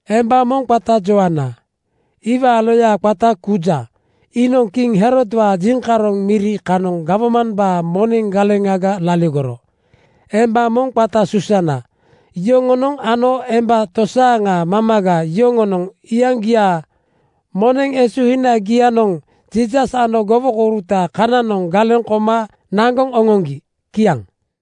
Emba moŋ qata Joana. Iwaa loya qata Kuza iinoŋ kiŋ Herodwaa jiŋkaroŋ miri kanoŋ gawmambaa moneŋ galeŋaga laligoro. Emba moŋ qata Susana. Yoŋonoŋ ano emba tosaaŋa mamaga yoŋonoŋ iyaŋgiaa moneŋ esuhinagianoŋ Jiisas ano gowokouruta kananoŋ galeŋ koma naŋgoŋ oŋoŋgi. Kiaŋ.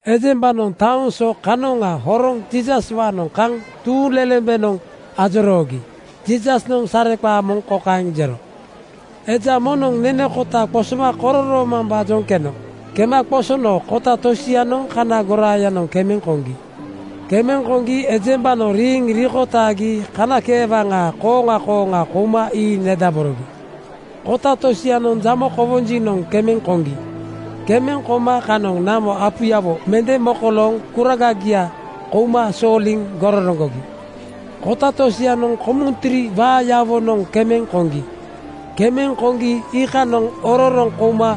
Ejembanoŋ taoŋ so kanoŋa horoŋ Jiisaswaanoŋ kaŋ tuuŋlelembenoŋ ajoroogi Jiisasnoŋ sareqaa moŋ kokaeŋ jero: “Eja moŋnoŋ nene kota qosoma kororoomambaajoŋ keno. Kema qosono kota tosianoŋ kana goraayanoŋ kemeŋ koŋgi. Kemeŋ koŋgi ejembanoŋ riiŋ rikotaagi kanakeewaŋaa (waraweŋ) kooŋa kooŋa kouma ii nedaborogi. Kota tosianoŋ jamo kowonjinoŋ kemeŋ koŋgi. Kemeŋ koma kanoŋ namo apuyawo mende mokolooŋ kuragagia kouma sooliŋ gororoŋgogi. “Kota tosianoŋ komuntiri waayawonoŋ kemeŋ koŋgi. Kemeŋ koŋgi iikanoŋ ororoŋ kouma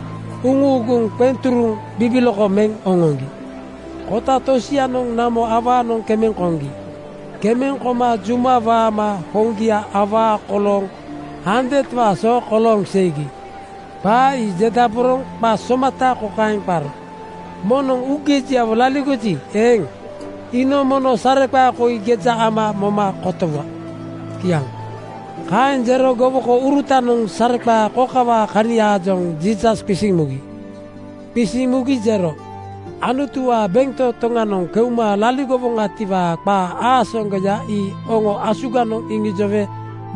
uŋuuguŋ qeŋ turuŋ bibiloko meŋ oŋoŋgi. Kota tosianoŋ namo awaanoŋ kemeŋ koŋgi. Kemeŋ koma juma waama hoŋgia awaa kolooŋ handewaa so kolooŋ seigi.” Qaa ii jedaboroŋ qa somata kokaeŋ qaro, “Moŋnoŋ uugejiawo laligoji eeŋ, iinoŋ mono sareqaa koi geja ama moma kotowa.” Kiaŋ. Kaeŋ jero gowokourutanoŋ sareqaa kokawaa kaniaajoŋ Jiisas qisiŋ mugi. Qisiŋ mugi jero, “Anutuwaa bentotoŋanoŋ keuma laligowoŋatiwaa qaa aasaŋgoya ii oŋo asuganoŋ iŋijowe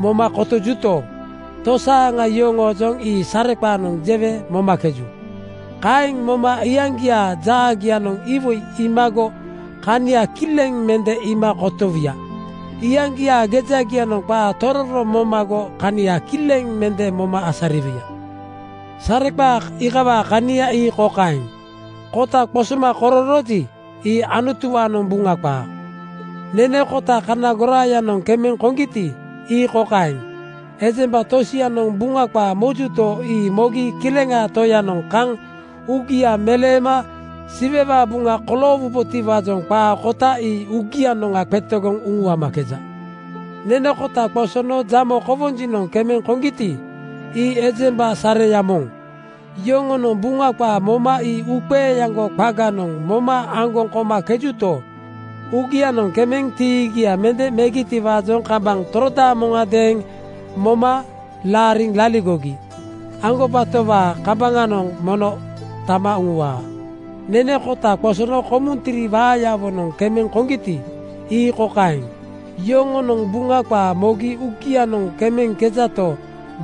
moma kotojuto, tosaaŋa yoŋoojoŋ ii sareqaanoŋ jewe momakeju. Kaeŋ moma iyaŋgiaa jaagianoŋ iwoi iimago kania kileŋ mende iima kotowuya. Iyaŋgiaa gejagianoŋ qaa tororo momago kania kileŋ mende moma asariwuya.” “Sareqaa iikawaa kania ii kokaeŋ: Kota qosoma kororooji, ii Anutuwaanoŋ Buŋa qaa. Nene kota kana goraayanoŋ kemeŋ koŋgiti, ii kokaeŋ: Ejemba tosianoŋ Buŋa qaa mojuto, ii mogi Kileŋaa Toyanoŋ kaŋ uugia meleema Siwewaa buŋa koloowubotiwaajoŋ qaa kota ii uugianoŋga qetegoŋ uŋuamakeja. Nene kota qosono jamo kowonjinoŋ kemeŋ koŋgiti, ii ejemba sareya moŋ. Yoŋonoŋ Buŋa qaa moma ii uuqeeaŋgo qaganoŋ moma aŋgoŋ komakejuto, uugianoŋ kemeŋ tiigia mende megitiwaajoŋ kambaŋ torodaamo-ŋadeeŋ moma laariŋ laligogi aŋgobatowaa kambaŋanoŋ mono tama uŋuwaa. “Nene kota qosono kumuntiri waayawonoŋ kemeŋ koŋgiti, ii kokaeŋ: Yoŋonoŋ Buŋa qaa mogi uugianoŋ kemeŋkejato,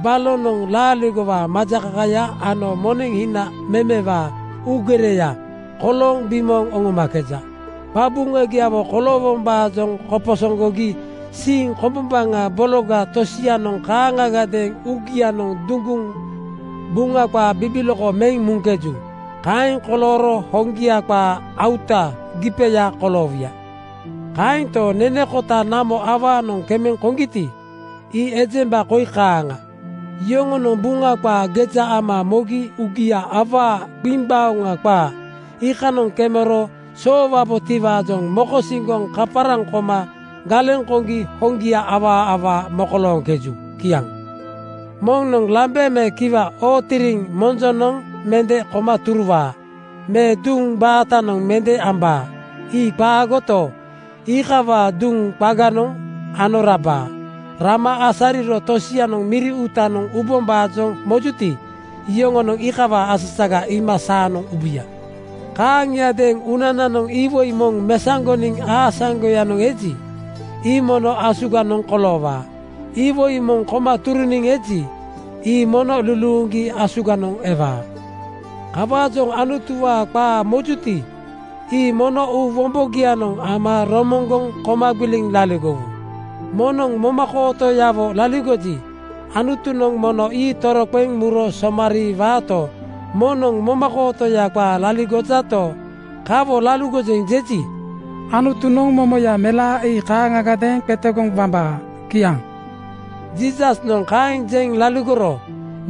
balonoŋ laaligowaa majakakaya ano moneŋ hina memewaa uugereya kolooŋ bimooŋ oŋomakeja. Qabuŋagiawo koloowombaajoŋ koposoŋgogi siiŋ kombombaŋa bologa tosianoŋ kaaŋagadeeŋ uugianoŋ duŋguŋ Buŋa qaa bibiloko meŋ muŋkeju. Kaeŋ kolooro hoŋgia qaa auta (gipeya) koloowuya. Kaento, nene kota namo awaanoŋ kemeŋ koŋgiti, ii ejemba koi kaaŋa: Yoŋonoŋ Buŋa qaa geja ama mogi uugia awaa gbiŋgbaoŋa qaa iikanoŋ kemero soowabotiwaajoŋ mokosiŋgoŋ kaparaŋ koma galeŋ koŋgi hoŋgia awaa awaa mokolooŋkeju.” Kiaŋ. “Moŋnoŋ lambe me kiwa ootiriŋ monjonoŋ mende koma turuwaa me duŋ baatanoŋ mende ambaa. Ii qaagoto, ii iikawaa duŋ qaganoŋ ano rabaa. Rama asariro tosianoŋ miri uutanoŋ ubombaajoŋ mojuti, yoŋonoŋ iikawaa asasaga iima saanoŋ ubuya. “Kaaŋiadeeŋ uunananoŋ iwoi moŋ mesaŋgoniŋ aasaŋgoyanoŋ eji, ii mono asuganoŋ koloowaa. Iwoi moŋ koma turuniŋ eji, ii mono luluuŋgi asuganoŋ ewaa. “Kawaajoŋ Anutuwaa qaa mojuti, ii mono uu wombogianoŋ ama romoŋgoŋ koma gbiliŋ laligowu. Moŋnoŋ momakootoyawo laligoji, Anutunoŋ mono ii toroqeŋ muro somariiwaato, moŋnoŋ momakootoya qaa laligojato, ‘Kawo laligojeŋ,’ jeji, Anutunoŋ mono momoya melaa ii kaaŋagadeeŋ qetegoŋ wambaa.” Kiaŋ. Jiisasnoŋ kaeŋ jeŋ laligoro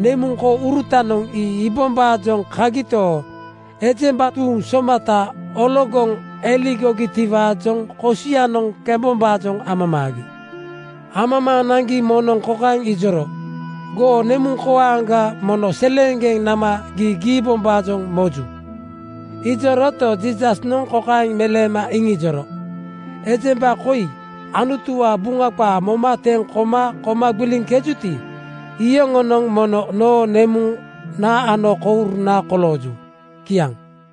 nemuŋ kourutanoŋ ii iibombaajoŋ kagito, ejemba tuuŋ somatanoŋ ologoŋ eligogitiwaajoŋ kosianoŋ kembombaajoŋ amamaagi. Amamaaŋ naŋgi moŋnoŋ kokaeŋ ijoro, “Goo nemuŋkoaŋga mono seleeŋgeŋ nama gii giibombaajoŋ moju.” Ijoroto, Jiisasnoŋ kokaeŋ meleema iŋijoro, “Ejemba koi Anutuwaa Buŋa qaa moma teŋ koma koma gbiliŋkejuti, iyoŋonoŋ mono noo nemuna ano kouruna kolooju.” Kiaŋ.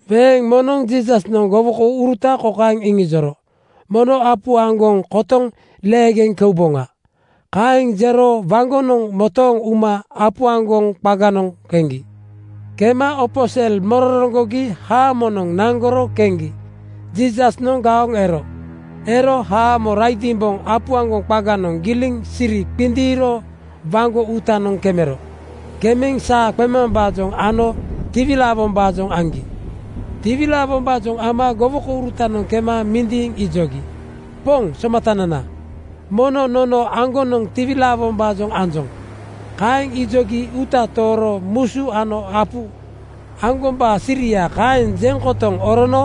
Weeŋ moŋnoŋ Jiisasnoŋ gowokouruta kokaeŋ iŋijoro, “Mono mesaoŋ apu aŋgoŋ kotoŋ leegeŋ keuboŋa.” Kaeŋ jero waŋgonoŋ motooŋ uma apu aŋgoŋ qaganoŋ keŋgi. Kema opo sel mororoŋgogi haamonoŋ naŋgoro keŋgi Jiisasnoŋ gaoŋ ero. Ero haamo raidimboŋ apu aŋgonoŋ giliŋ siri qindiiro waŋgo uutanoŋ kemero. Kemeŋ saa qemambaajoŋ ano tiwilaawombaajoŋ aŋgi. Tiwilaawombaajoŋ ama gowokourutanoŋ kema mindiiŋ ijogi, “Poŋ Somatanana, mono nono aŋgonoŋ tiwilaawombaajoŋ anjoŋ.” Kaeŋ ijogi uuta tooro musu ano apu aŋgombaa siria kokaeŋ jeŋ kotoŋ orono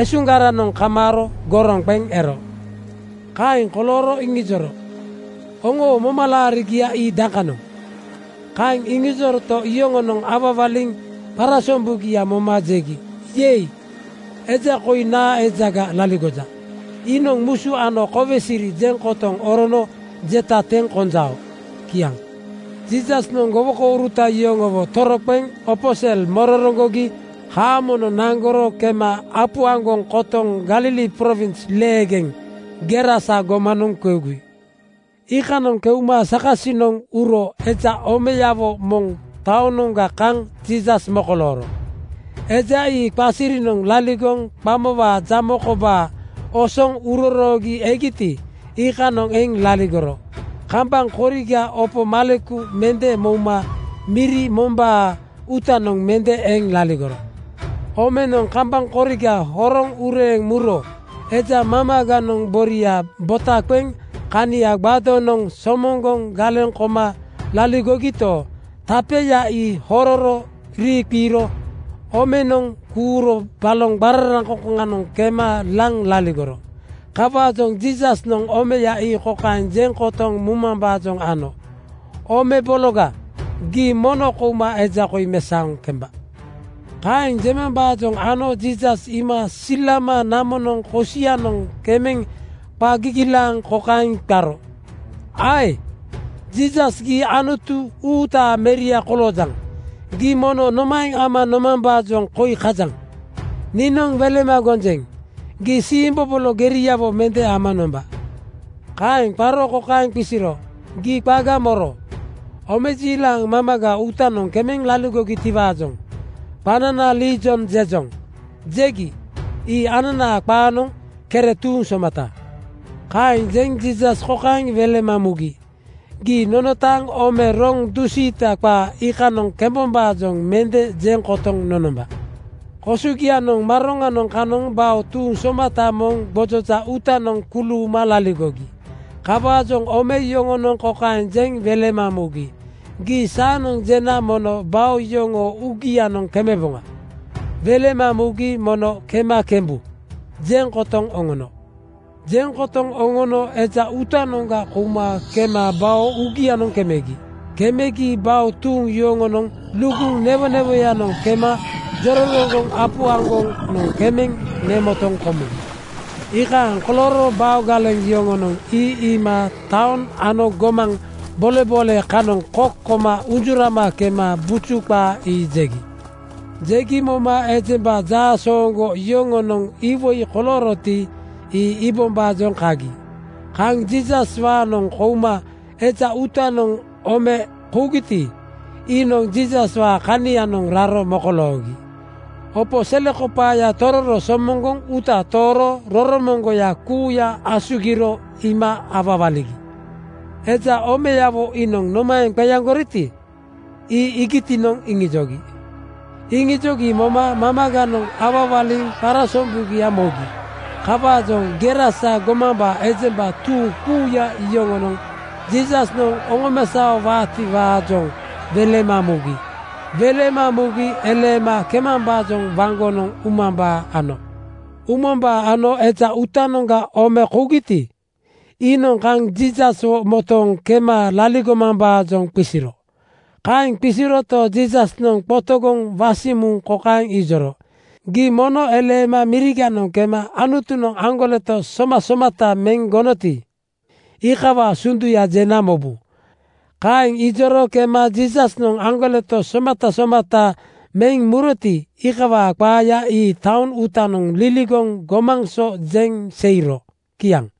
esuŋgaranoŋ kamaaro goroŋ qeŋ ero. Kaeŋ kolooro iŋijoro, “Oŋoo momalaarigia ii dakanoŋ?” Kaeŋ iŋijoroto, yoŋonoŋ awawaliŋ qarasombugia moma jegi, “Yei! Eja koi naa ejaga laligoja? Iinoŋ musu ano kowe siri jeŋ kotoŋ orono jeta teŋ konjao.” Kiaŋ. Jiisasnoŋ gowokouruta yoŋowo toroqeŋ opo sel mororoŋgogi haamonoŋ naŋgoro kema apu aŋgoŋ kotoŋ Galili prowins leegeŋ Gerasa gomanoŋ keugi. Iikanoŋ keuma sakasinoŋ uro eja omeyawo moŋ taonoŋga kaŋ Jiisas mokolooro. Eja ii qasirinoŋ laligoŋ qamowaa jamo kobaa osoŋ uroroogi egiti, iikanoŋ eŋ laligoro. Kambaŋ koriga opo maleku mende mouma miri mombaa uutanoŋ mende eŋ laligoro. Omenoŋ kambaŋ koriga horoŋ ureeŋ muro eja mamaganoŋ boria bota qeŋ kania gbadonoŋ (tapenoŋ) somoŋgoŋ galeŋ koma laligogito, tapeya ii hororo riiqiiro omenoŋ kuuro baloŋ qararaŋkoŋkoŋanoŋ kema laŋ laligoro. Kawaajoŋ Jiisasnoŋ omeya ii kokaeŋ jeŋ kotoŋ mumambaajoŋ ano, “Ome bologa, gii mono kouma eja koi mesaoŋ kemba.” Kaeŋ jemambaajoŋ ano Jiisas iima silama namonoŋ kosianoŋ kemeŋ qa gigilaaŋ kokaeŋ qaro, “Ae Jiisas, gii Anutu uutaa meria koloojaŋ. Gii mono nomaeŋ ama nomambaajoŋ koi kajaŋ? Niinoŋ welema gonjeŋ: Gii siimbobolo geriawo mende ama nomba.” Kaeŋ qaro kokaeŋ qisiro, “Gii qaga moro?” Omejiilaŋ mamaga uutanoŋ kemeŋ laligogitiwaajoŋ “Qanana Liijon jejoŋ,” jegi. Ii ananaa qaanoŋ Kere tuuŋ somata. Kaeŋ jeŋ Jiisas kokaeŋ welema mugi, “Gii nonotaaŋ ome roŋ dusiita qaa iikanoŋ kemebombaajoŋ mende jeŋ kotoŋ nonomba.” Kosogianoŋ maroŋa kanoŋ bao tuuŋ somata moŋ gbojoja uutanoŋ kuluuma laligogi. Kawaajoŋ ome yoŋonoŋ kokaeŋ jeŋ welema mugi, “Gii saanoŋ jena nono bao yoŋoo uugianoŋ kemeboŋa.” Welema mugi “Mono kema kemebu,” jeŋ kotoŋ oŋono. Jeŋ kotoŋ oŋono eja uutanoŋga kouma kema bao uugianoŋ kemegi. Kemegi bao tuuŋ yoŋonoŋ luguŋ newonewonoŋ kema jororoŋgoŋ apu aŋgonoŋ kemeŋ nemotoŋ komugi. Iikaeŋ kolooro bao galeŋ yoŋonoŋ ii iima taoŋ ano gomaŋ boleboole kanoŋ kok koma unjurama kema buju qaa ii jegi. Jegi moma ejemba jaasooŋgo yoŋonoŋ iwoi kolooroti, ii iibombaajoŋ kagi. Kaŋ Jiisaswaanoŋ kouma eja uutanoŋga omenoŋ kougiti, iinoŋ Jiisaswaa kanianoŋ raro mokoloogi. Opo selekopaaya tororo somoŋgoŋ uuta tooro roromoŋgoya kuuya asugiro iima awawaligi. Eja omeyawo iinoŋ nomaeŋ qeaŋgoroti, ii iigitinoŋ iŋijogi. Iŋijogi moma mamaganoŋ awawaliŋ qarasombugia mogi. Kawaajoŋ Gerasa gomambaa ejemba tuuŋ kuuya yoŋonoŋ Jiisasnoŋ oŋomesaowaatiwaajoŋ welema mugi. Welema mugi eleema kemambaajoŋ waŋgonoŋ umambaa ano. Umambaa ano eja uutanoŋga ome kougiti, iinoŋ kaŋ Jiisaswo motooŋ kema laligomambaajoŋ qisiro. Kaeŋ qisiroto, Jiisasnoŋ qotogoŋ wasiŋ muŋ kokaeŋ ijoro, “Gii mono eleema miriganoŋ kema Anutunoŋ aŋgoleto somasomata meŋ gonoti, iikawaa sunduya jena mobu.” Kaeŋ ijoro kema Jiisasnoŋ aŋgoleto somasomata meŋ muroti, iikawaa qaaya ii taoŋ uutanoŋ liligoŋ gomaŋ so jeŋ seiro. Kiaŋ.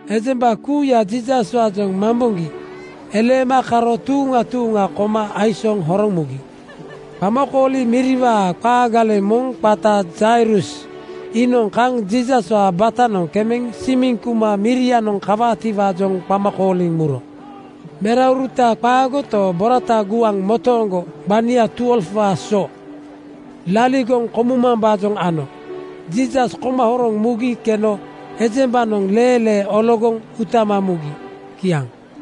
Ejemba kuuya Jiisaswaajoŋ mamboŋgi eleema karo tuuŋa tuuŋa koma aisooŋ horoŋ mugi. Qamakooli miriwaa qaa galeŋ moŋ qata Jairus iinoŋ kaŋ Jiisaswaa batanoŋ kemeŋ simiŋ kuma mirianoŋ kawaatiwaajoŋ qama kooliŋ muro. Merauruta qaato, borata guaŋ motooŋgo gbania 12:waa so laligoŋ komumambaajoŋ ano. Jiisas koma horoŋ mugi keno ejembanoŋ leelee ologoŋ utama mugi. Kiaŋ.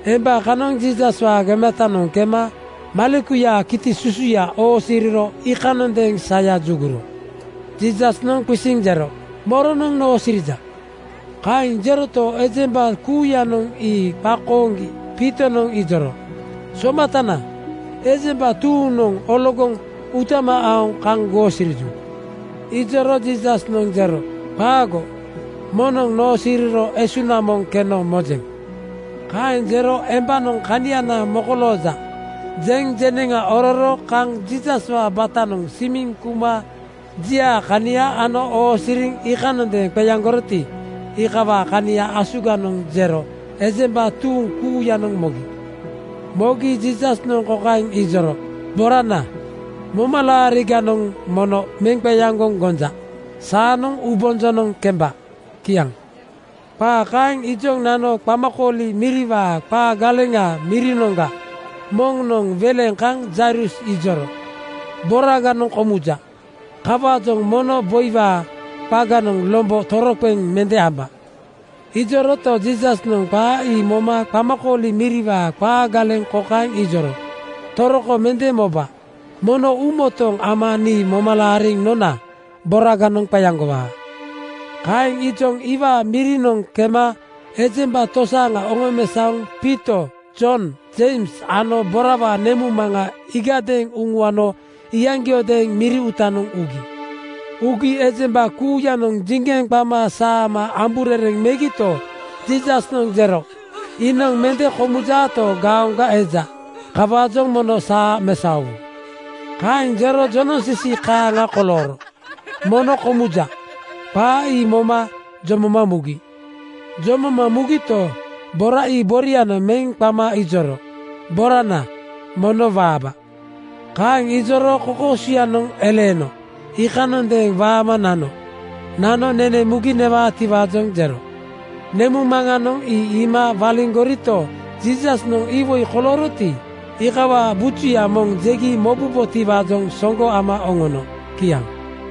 Emba kanoŋ Jiisaswaa gematanoŋ kema malekuyaa kiti susuya oosiriro iikanondeeŋ saya juguro. Jiisasnoŋ qisiŋ jero, “Moronoŋ noosirija?” Kaeŋ jeroto, ejemba kuuyanoŋ ii qakooŋgi Piitonoŋ ijoro, “Somatana, ejemba tuuŋnoŋ ologoŋ utama aoŋ kaŋ goosiriju.” Ijoro Jiisasnoŋ jero, “Qaago, moŋnoŋ noosiriro esuŋna moŋ keno mojeŋ.” Kaeŋ jero embanoŋ “Kaniana mokolooja,” jeŋ jeneŋa ororo kaŋ Jiisaswaa batanoŋ simiŋ kuma jiaa kania ano oosiriŋ iikanondeeŋ qeaŋgoroti, iikawaa kania asuganoŋ jero ejemba tuuŋ kuuyanoŋ mogi. Mogi Jiisasnoŋ kokaeŋ ijoro, “Borana, momalaariganoŋ mono meŋ qeaŋgoŋ gonja. Saanoŋ uubonjonoŋ kemba.” Kiaŋ. Qaa kaeŋ ijoŋ nano qamakooli miriwaa qaa galeŋaa mirinoŋga moŋnoŋ weleŋ kaŋ Jairus ijoro, “Boraganoŋ komuja! Kawaajoŋ mono boiwaa qaganoŋ lombo toroqeŋ mende amba.” Ijoroto, Jiisasnoŋ qaa ii moma qamakooli miriwaa qaa galeŋ kokaeŋ ijoro, “Toroko mende moba. Mono uumotooŋ ama nii moma laariŋ nona boraganoŋ qeaŋgowaa.” Kaeŋ ijoŋ iwaa mirinoŋ kema ejemba tosaaŋa oŋomesaoŋ Piito, Jon, Jeims ano borawaa nemuŋmaŋa iigadeeŋ uŋuano iyaŋgiodeeŋ miri uutanoŋ ugi. Ugi ejemba kuuyanoŋ jiŋgeŋ qama saama amburereŋ megito, Jiisasnoŋ jero, “Iinoŋ mende komujato, gaoŋga eja. Kawaajoŋ mono saa mesaowu.” Kaeŋ jero jonoŋsisi kaaŋa kolooro “Mono komuja!” qaa ii moma jomoma mugi. Jomoma mugito, bora ii borianoŋ meŋ qama ijoro, “Borana, mono waaba.” Kaeŋ ijoro kokoosuyanoŋ eleeno iikanondeeŋ waama nano. Nano nene mugi newaatiwaajoŋ jero. Nemuŋmaŋanoŋ ii iima waliŋgorito, Jiisasnoŋ iwoi kolooroti, iikawaa bujuya moŋ jegi mobubotiwaajoŋ soŋgo ama oŋono. Kiaŋ.